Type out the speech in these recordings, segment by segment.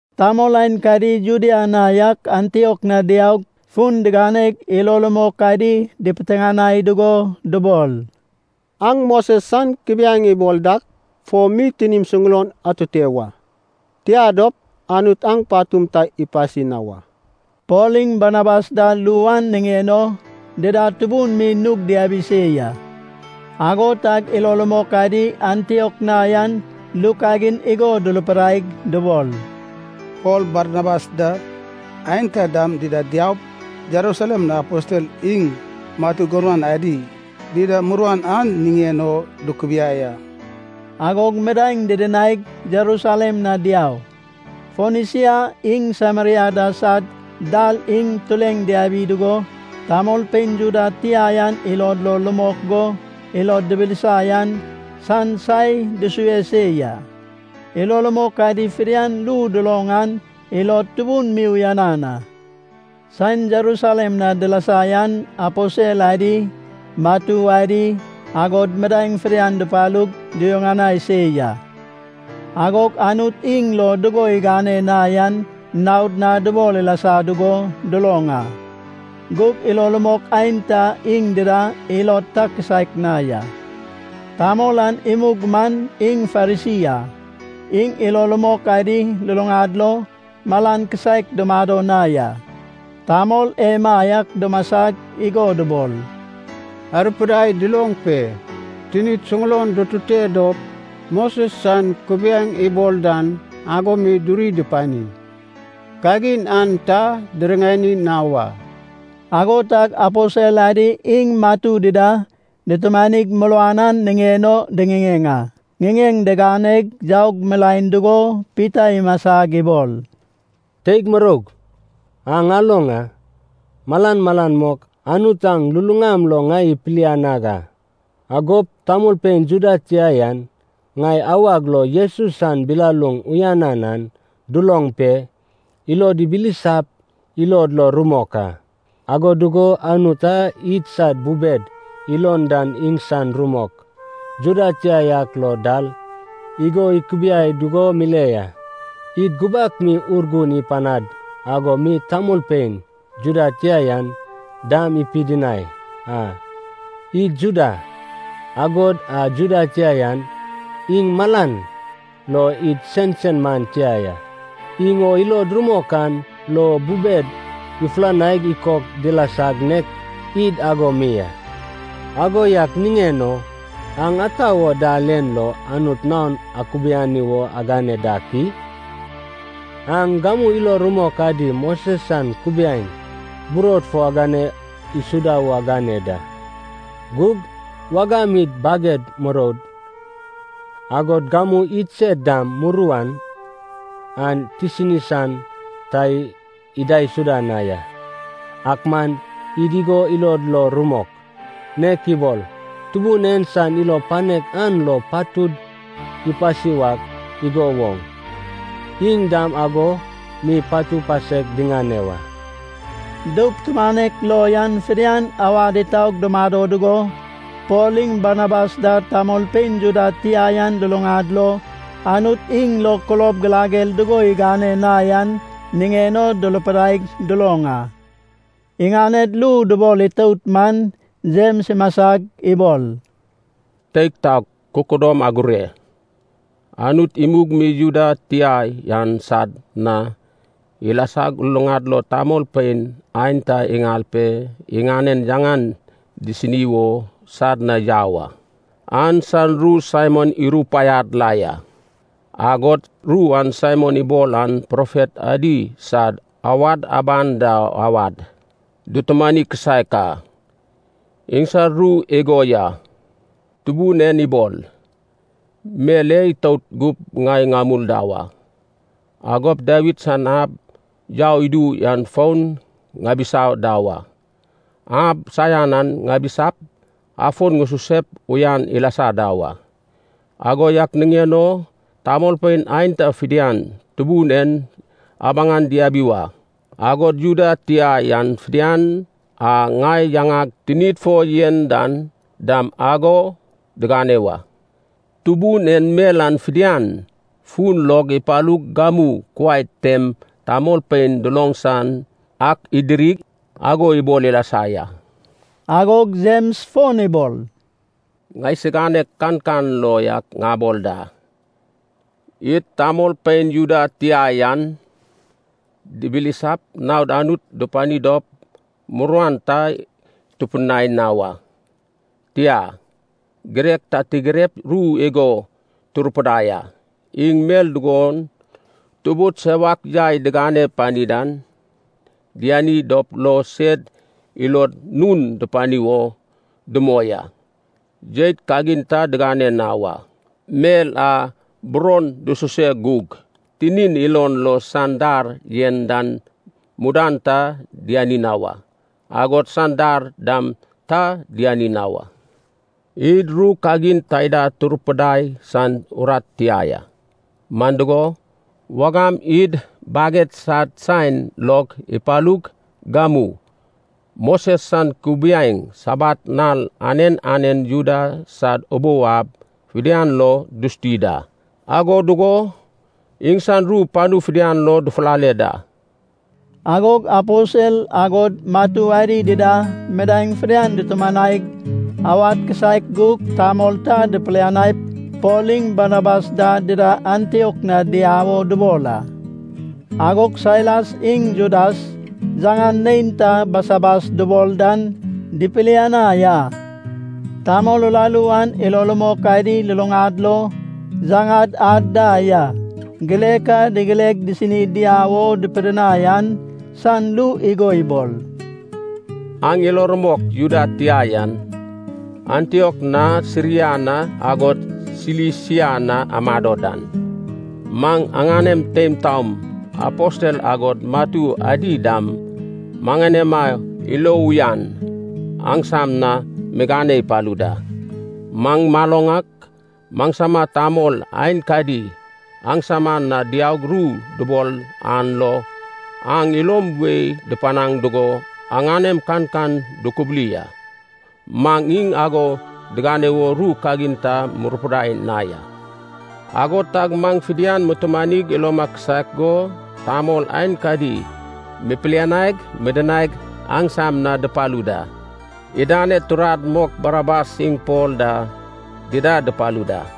Tamol aenkadi Judea na yak Antiok na diaug, fun diganeg ilo rumok adi dipiteŋanai dugo dubol, “Aŋ Moses san kubiaeŋ ibol dak fo mi tinim suŋulon atute wa. Tia dop, Anut aŋ patum ta ipasi na wa.” Pol iŋ Barnabas da ru an niŋen o dida tubun mi nug diabi se ya. Ago tag ilo rumok adi Antiok na yan ru kagin igo durupidaig dubol, “Pol Barnabas da, aenta dam dida diaup, Jerusalem na aposel iŋ matu gurman adi dida muruan an niŋen o dukubiai a.” Agog midaeŋ didinaig, Jerusalem na diau. Fonisia iŋ Sameria da sad dal im tureŋ diabi dugo, tamolpein Juda tia yan ilod lo rumok go ilod dibilisa yan san sae dusue se ya. Ilo rumok adi fidian ru duloŋ an ilod tubun mi uyanan a. Saen Jerusalem na dilasa yan aposel adi, matu adi, agod midaeŋ fidian dupalug duyuŋanai se ya. Agog Anut iŋ lo dugo igane na yan naod na dubol ilasa dugo duloŋ a. Gug ilo rumok aenta iŋ dida ilod ta kisaek na ya. Tamol an imug man iŋ Farisi a. Iŋ ilo rumok adi luluŋad lo malan kisaek dumado na ya. Tamol emaiak dumasag igo dubol, “Arupidai duloŋ pe, tinid suŋulon dutute dop Moses san kubiaeŋ ibol dan ago mi duri dupani. Kagin an ta diriŋani na wa.” Ago tag aposel adi iŋ matu dida dutumanig muruan an niŋen o diŋiŋeŋ a. Ŋiŋeŋ diganeg yaug milaen dugo Pita imasag ibol, “Teig muroug, aŋ aloŋ a. Malan malan mok Anut aŋ luluŋam lo ŋai ipilianag a. Agop tamolpein Juda tia yan ŋai awag lo Jesus san bilaluŋ uyanan an duloŋ pe, ilod dibilisap, ilod lo rumok a. Ago dugo Anut a idsad bubed iloŋ dan iŋsan rumok Juda tia yak lo dal igo ikubiai dugo mile ya, id gubak mi Urgun ipanad ago mi tamolpein Juda tia yan dam ipidinai a. Id Juda, agod a Juda tia yan iŋ malan lo id sensen man tia ya. Iŋ o ilod rumok an lo bubed ifulanaig ikok dilasag nek id ago mi a. Ago yak niŋen o aŋ ata wo dal en lo Anut naon akubiani wo agane dak i? Aŋ gamu ilo rumok adi Moses san kubiaeŋ burod fo agane isuda wo agane da. Gug wagam id baged muroud, agod gamu idsed dam muruan an tisini san ta idaisuda na ya. Ak man id igo ilod lo rumok, nek ibol Tubun en san ilo panek an lo patud ipasi wak igo woŋ, iŋ dam ago mi patu pasek diŋane wa.” Doup tumanek lo yan fidian awad itaug dumado dugo Pol iŋ Barnabas da tamolpein Juda tia yan luluŋad lo Anut iŋ lo kulob girager dugo igane na yan niŋen durupidaig duloŋ a. Iŋaned ru dubol itout man Jems imasag ibol, “Teig taog, kududom agure! Anut imug mi Juda tia yan sad na ilasag luluŋad lo tamolpein aenta iŋal pe iŋanen yaŋan disini wo sad na yau a, an san ru Saimon irupaiad la ya. Agod ru a Saimon ibol an profet adi sad awad aban da awad dutumani kisaek a. Iŋsad ru igo ya, ‘Tubun en ibol, mel en itout gup ŋai ŋamul da wa. Agop Dawid san ab yau idu yan fon ŋabisa da wa. Ab saian an ŋabisap, afon ŋususep uyan ilasa da wa. Ago yak niŋen o tamolpein aenta fidian Tubun en abaŋan diabi wa. Agod Juda tia yan fidian a ŋai yaŋag tinid fo yen dan dam ago digane wa.’ Tubun en mel an fidian, fun log ipalug gamu kuai tem tamolpein duloŋ san ak idirig, ago ibol ilasa ya.” Agog Jems fon ibol, “Ŋaisiganeg kankan lo yak ŋabol da. Id tamolpein Juda tia yan dibilisap naod Anut dupani dop muruan ta tupidinai na wa. Tia, girek ta tigirep ru igo turupidai a. Iŋ mel dugon tubud sewak yai digane pani dan diani dop lo sed ilod nun dupani wo dumoi a. Jeit kagin ta digane na wa. Mel a buron dususe gug tinin ilon lo san dar yen dan mudan ta diani na wa. Agod san dar dam ta diani na wa. Id ru kagin taida turupidai san urat tia ya. Man dugo, wagam id baged sad saen log ipalug gamu, Moses san kubiaeŋ Sabat nal anen anen Juda sad ubou ab fidian lo dusuti da. Ago dugo iŋsan ru panu fidian lo dufulale da.” Agog aposel, agod matu adi dida midaeŋ fidian dutumanaig, awad kisaek gug tamol ta dipilianaip Pol iŋ Barnabas da dida Antiok na diau wo dubol a. Agog Sailas, iŋ Judas yaŋan neinta Basabas dubol dan dipilianai a. Tamol uraru an ilo rumok adi luluŋad lo yaŋad ad da ya. Girek a digireg disini diau o dupidinai an san ru igo ibol: “Aŋ ilo rumok Juda tia yan, Antiok na Siria na agod Silisia na amado dan, maŋ aŋanem teim taom, aposel agod matu adi dam maŋanema ilo uyan aŋsam na migane ipalu da. Maŋ maloŋ ak maŋsama tamol aenkadi aŋsam na diaug ru dubol an lo aŋ ilo wei dupanaŋ dugo aŋanem kankan dukubuli a. Maŋ iŋ ago digane wo ru kagin ta murupidai na ya. Ago tag maŋ fidian mutumanig iloma kisaek go tamol aenkadi mipilianaig midinaig aŋsam na dupalu da. Idaned turad mok Barnabas iŋ Pol da dida dupalu da.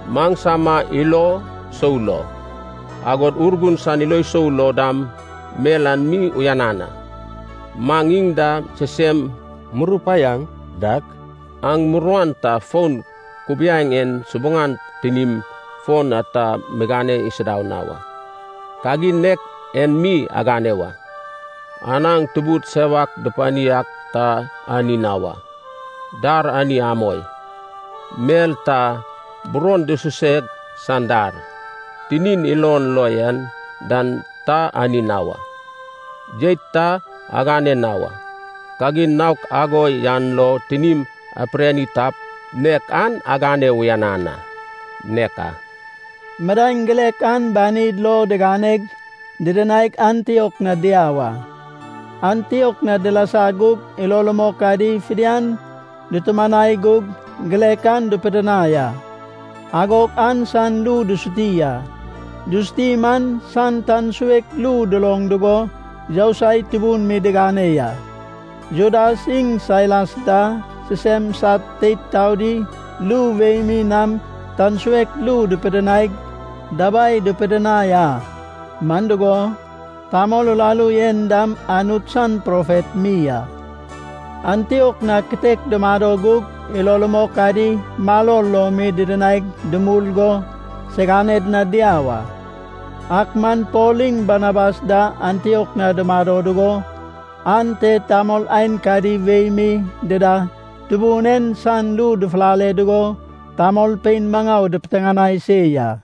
Maŋsama ilo sou lo, agod Urgun san ilo sou lo dam, mel en mi uyanan a. Maŋ iŋ da sisem murupaiaŋ dak, aŋ muruan ta fon kubiaeŋ en subuŋan tinim fo ta migane isuda na wa. Kagin nek en mi agane wa. Anaŋ tubud sewak dupani ak ta ani na wa. Dar ani amoi. Mel ta buron dususeg san dar tinin ilon lo yen dan ta ani na wa. Jeit ta agane na wa. Kagin naok ago yan lo tinim apirani tap, nek an agane uyanan a. Nek a.” Midaeŋ girek an banid lo diganeg didinaig Antiok na diau a. Antiok na dilasa gug ilo rumok adi fidian dutumanai gug girek an dupidinai a. Agog an san ru dusuti a. Dusuti man, san tan suek ru duloŋ dugo yousai tubun mi digane ya. Judas iŋ Sailas da sisem sad teid taodi ru wei mi nam tan suek ru dupidinaig dabai dupidinai a. Man dugo, tamol uraru en dam Anut san profet mi a. Antiok na kitek dumado gug ilo rumok adi maror lo mi didinaig dumul go, siganed na diau a. Ak man Pol iŋ Barnabas da Antiok na dumado dugo, ante tamol aenkadi wei mi dida Tubun en san ru dufulale dugo tamolpein maŋau dipiteŋanai se ya.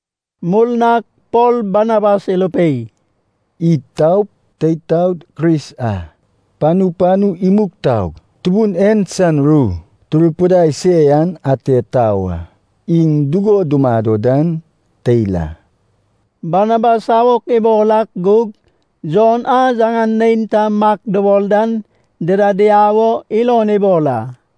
Murnag Pol Barnabas irupei, “Id taup, teid taod Kris a panu panu imug taug Tubun en san ru turupidai se yan ate tau a. Iŋ dugo dumado dan teil a.” Barnabas awok ibol ak gug Jon a yaŋan neinta Mak dubol dan dida diau o ilon ibol a.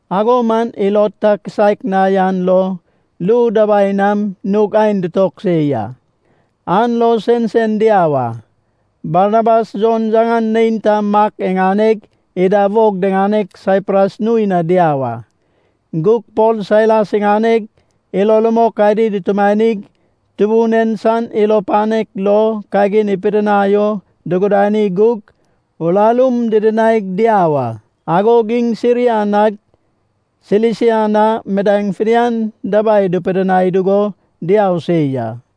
Ago man ilod ta kisaek na yan lo ru dabai nam nug aen dutog se ya. An lo sensen diau a. Barnabas Jon yaŋan neinta Mak iŋaneg ida wog diŋaneg Saipras nui na diau a. Gug Pol Sailas iŋaneg, ilo rumok adi dutumanig Tubun en san ilo panek lo kagin ipidinai o dugudani gug, urarum didinaig diau a. Agog iŋ Siria nag Silisia na midaeŋ fidian dabai dupidinai dugo diau se ya.